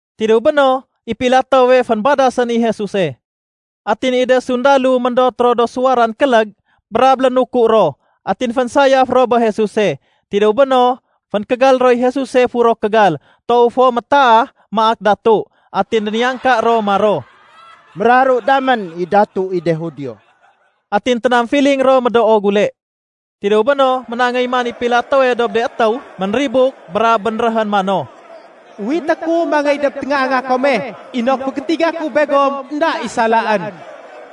Tidéw béno, i Pilatowe fénbadasén i Jesuse. Atin i de sundalo méndot ro do suwaran kélég brab lénuku ro, atin fénsayaf ro bé Jesuse. Tidéw béno, fénkégal roy Jesuse furo kégal toow fo métaah, maak datu. Atin déniyangka ro maro, “Méraru damén i datu i de Judio.” Atin ténamfiling ro médoo gule. Tidéw béno, ménangéy man i Pilatowe dob de étéw ménribuk brab bénréhén mano, “Uwité ku mangéy dob téngaanga kome inok fégétiga ku begom énda i salaén.”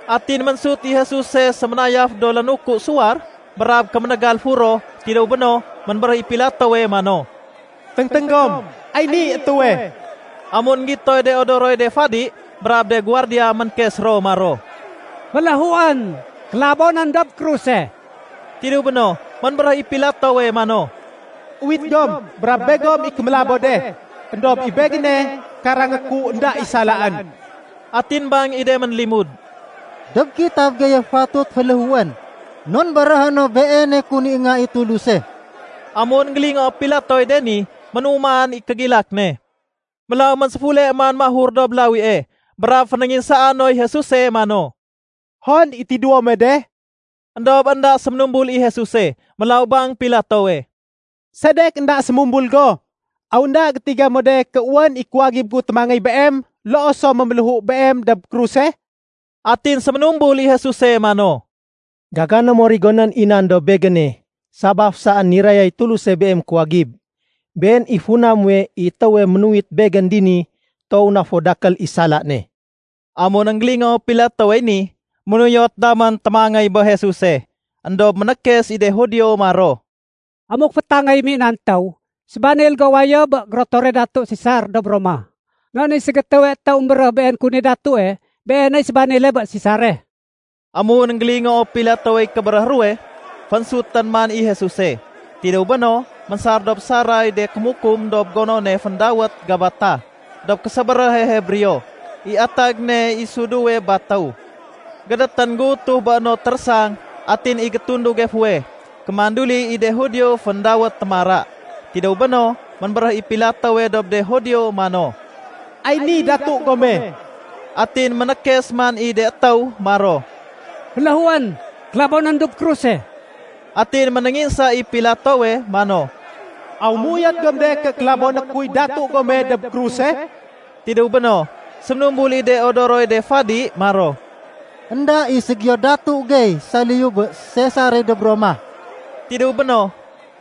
Atin ménsut i Jesuse séménayaf do lénuku suwar brab kéménégal furo. Tidéw béno, ménbéréh i Pilatowe mano, “Téngténg gom, ay niy étéwe.” Amun énggitoy de odoroy de fadi brab de guwardiya, ménkes ro maro, “Féléhuén, kélabonén dob kruse!” Tidéw béno, ménbéréh i Pilatowe mano, “Uwit gom brab begom i kémélabo de. Endob i begéne, karangé ku énda i salaén.” Atin bang i de ménlimud, “Dob kitab geye fatut féléhuén non béréhé no Beene kun i Nga i Tuluse.” Amun énggélingoo Pilatowey de ni, ménuman i kégilak ne. Mélaw ménséfule man mahur dob lawie brab fénénginsaa noy Jesuse mano, “Hon i tidéwo muwe de?” Endob énda séménumbul i Jesuse. Mélaw bang Pilatowe, “Sedek énda sémumbul go? Aw énda gétiga mo de ké wén i kuwagib gu témangéy Beem, loo so méméléhu Beem dob kruse?” Atin séménumbul i Jesuse mano, “Gagané mo rigonén i nan dob Begéne sabaf saén nirayay Tuluse beem kuwagib. Been i funa nuwe i étéwe ménuwit Begén dini toow na fo dakél i sala ne.” Amun énggélingoo Pilatowey ni, ménuyot damén témangéy bé Jesuse. Endob ménékes i de Judio maro, “Amuk fétangéyém i nan étéw, sébanil go wayo bé gérotore datu Sesar dob Roma. Non i ségétéwe étéw émbéréh been kun i datue, beeney sébanile bé Sesare.” Amun énggélingoo Pilatowey kébéréh ruwe, fénsutén man i Jesuse. Tidéw béno, ménsar dob saray de kémukum dob gonone féndawét Gabata dob késébéréhe Hebreo (i atag ne i suduwe batéw.) Gédétén géutuh bé no térésang atin i gétunduge fuweh, kémanduli i de Judio féndawét “Témara”. Tidéw béno, ménbéréh i Pilatowe dob de Judio mano, “Ay ni datu gome.” Atin ménékes man i de étéw maro, “Féléhuén, kélabonén dob kruse!” Atin ménénginsa i Pilatowe mano, “Aw méuyot gom de ké kélaboné kuy datu gome dob kruse?” Tidéw béno, séménumbul i de odoroy de fadi maro, “Enda i ségiyo datu gey saliyu bé Sesare dob Roma.” Tidéw béno,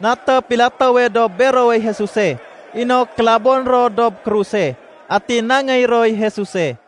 naté Pilatowe dob berowey Jesuse inok kélaboné ro dob kruse. Atin nangéy roy Jesuse.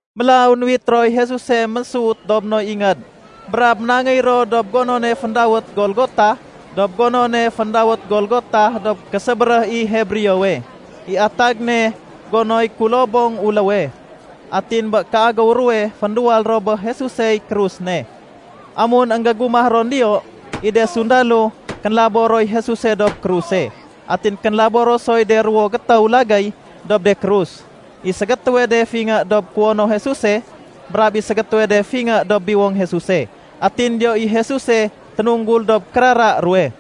Mélaw nuwit roy Jesuse mésut dob no ingéd brab ménangéy ro dob gonone féndawét Golgota dob gonone féndawét Golgota dob késébéréh i Hebreowe (i atag ne “gonoy kulobong uléwe”). Atin bé kéagéw ruwe fénduwal ro bé Jesusey krus ne. Amun énggégumah ron diyo, i de sundalo, kénlabo roy Jesuse dob kruse. Atin kénlabo ro soy de ruwo gétéw lagéy dob de krus. I ségétéwe de fingé dob kuwono Jesuse, brab i ségétéwe de fingé dob biwong Jesuse. Atin diyo i Jesuse ténunggul dob kérara ruwe.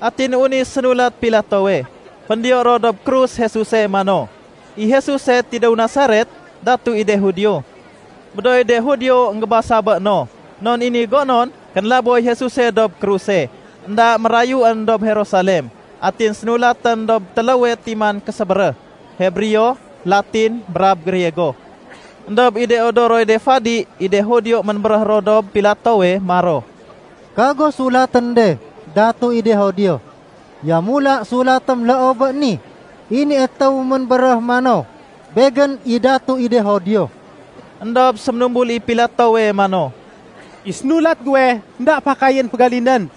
Atin wén i sénulat Pilatowe, féndiyo ro dob krus Jesuse mano, “I Jesuse tidéw Nasaret, datu i de Judio.” Médooy de Judio énggébasa bé no non i ni gonon kénlaboy Jesuse dob kruse énda mérayuén dob Jerusalem. Atin sénulatén dob téléwe timan késébéréh, Hebreo, Latin, brab Griego. Endob i de odoroy de fadi i de Judio ménbéréh ro dob Pilatowe maro, “Kago sulatén de ‘Datu i de Judio’. Yamula sulatém loo bé ni, ‘I ni étéw ménbéréh mano, Begén i datu i de Judio.’” Endob séménumbul i Pilatowe mano, “I sénulat guwe, énda fakayén fégalinén.”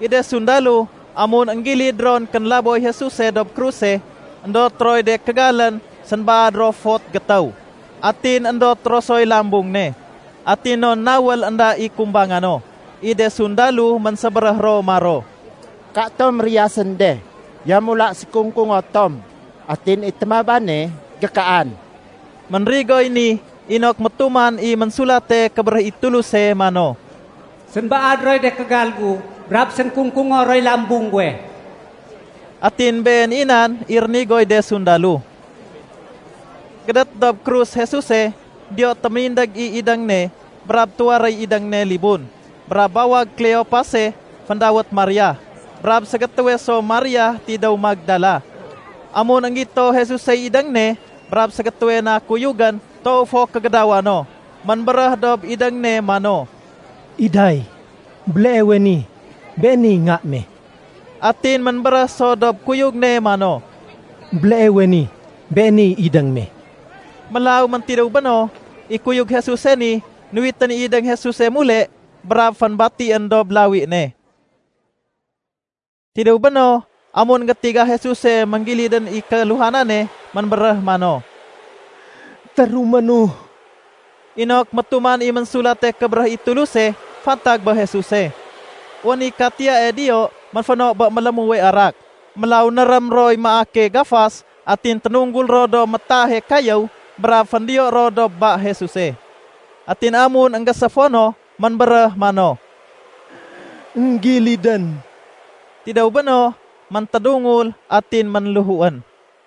I de sundalo, amun énggilid ron kénlaboy Jesuse dob kruse, éndot roy de kégalén, sénbaad ro fot gétéw. Atin éndot ro soy lambung ne. Atin non nawél énda i kumbanga no, i de sundalo ménsébéréh ro maro, “Katom riyasén de. Yamula sékung-kungo tom, atin i témabane gékaan.” Ménrigoy ni inok métuman i Ménsulate Kébéréh i Tuluse mano, “Sénbaad roy de kégal gu brab sénkung-kungo roy lambung guwe.” Atin been i nan i rénigoy de sundalo. Gédét dob krus Jesuse, diyo téménindég i idéng ne, brab tuwaréy idéng ne libun, brab bawag Kleopase féndawét Maria, brab ségétéwe so Maria tidéw Magdala. Amun énggito Jesusey idéng ne brab ségétéwe na kuyugén toow fo kégédawa no, ménbéréh dob idéng ne mano, “Iday, béleewe ni beeney nga me.” Atin ménbéréh so dob kuyug ne mano, “Béleewe ni beeney idéng me.” Mélaw méntidéw bé no, i kuyug Jesuse ni nuwitén i idéng Jesuse mule brab fénbatién dob lawi ne. Tidéw béno, amun énggétiga Jesuse ménggilidén i kéluhanane, ménbéréh mano, “Téruménu,” inok métuman i Ménsulate Kébéréh i Tuluse fantag bé Jesuse. Wén i katiyae diyo ménféno bé mélémuwe arak. Mélaw nérém roy maake gafas atin ténunggul ro dob métaahe kayéw brab féndiyo ro dob ba Jesuse. Atin amun énggéséfo no, ménbéréh mano, “Enggilidén.” Tidéw béno, méntédungul atin ménléhuén.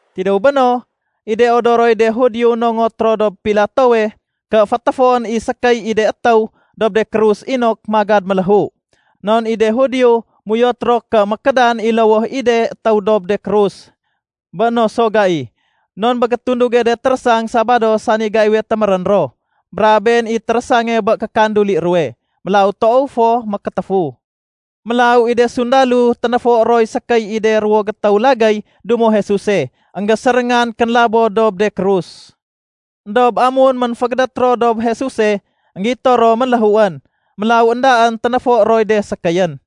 Tidéw béno, i de odoroy de Judio nongot ro dob Pilatowe ké fétéfoén i sékéy i de étéw dob de krus inok magad méléhu. Non i de Judio méuyot ro ké mékédan i lowoh i de étéw dob de krus bé no so gai, non bé gétunduge de térésang Sabado sani gaiwe témérén ro. Brab been i térésange bé kékanduli ruwe. Mélaw toow fo mékétéfu. Mélaw i de sundalo ténéfo roy sékéy i de ruwo gétéw lagéy dumo Jesuse énggéséréngan kénlabo dob de krus. Endob amun ménfégédét ro dob Jesuse, énggito ro ménléhuén. Mélaw éndaén ténéfo roy de sékéyén.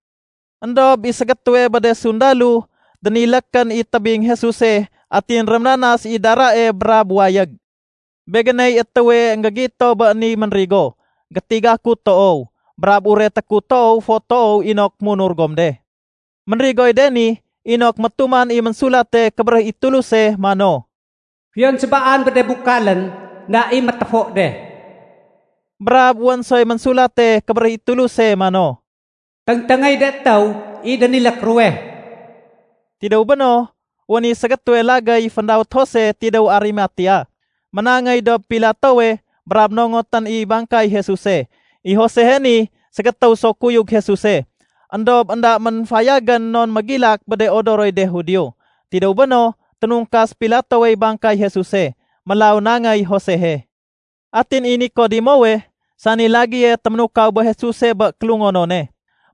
Endob i ségétéwe bé de sundalo dénilékén i tébing Jesuse atin réménanas i darae brab wayég. Begéney étéwe énggégito bé ni ménrigo. Gétiga ku toow, brab ureté ku toow fo toow inok munur gom de. Ménrigoy de ni inok métuman i Ménsulate Kébéréh i Tuluse mano, “Fiyon sébaan bé de bukalén, énda i météfo de.” Brab wén soy Ménsulate Kébéréh i Tuluse mano, “Téngténgéy de étéw i dénilék ruwe.” Tidéw béno, wén i ségétéwe lagéy féndawét Jose tidéw Arimatea, ménangéy dob Pilatowe brab nongotén i bangkay Jesuse. I Josehe ni ségétéw so kuyug Jesuse éndob énda ménfayagén non mégilak bé de odoroy de Judio. Tidéw béno, ténungkas Pilatowey bangkay Jesuse, mélaw nangéy Josehe. Atin i Nikodemowe sani lagéye téménukaw bé Jesuse bé kélungonone,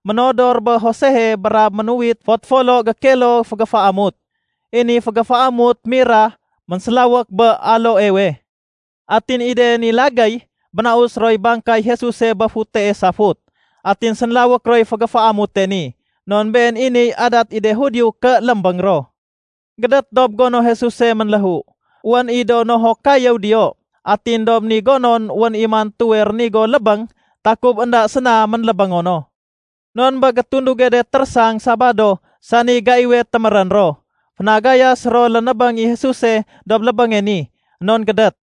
ménodor bé Josehe brab ménuwit fot folo gékilo fégéféamut. (I ni fégéféamut mira ménsélawék bé aloewe.) Atin i de ni lagéy bénaus roy bangkay Jesuse bé futee safut atin sénlawék roy fégéféamute ni. Non been i niy adat i de Judio ké lémbéng ro. Gédét dob gono Jesuse ménléhu, wén i do nohok kayéw diyo. Atin dob ni gonon wén i mantuwe rénigo lébéng takub énda séna ménlébéngo no. Non bé gétunduge de térésang Sabado sani gaiwe témérén ro, fénagayas ro lénébéng i Jesuse dob lébénge ni, non gédét.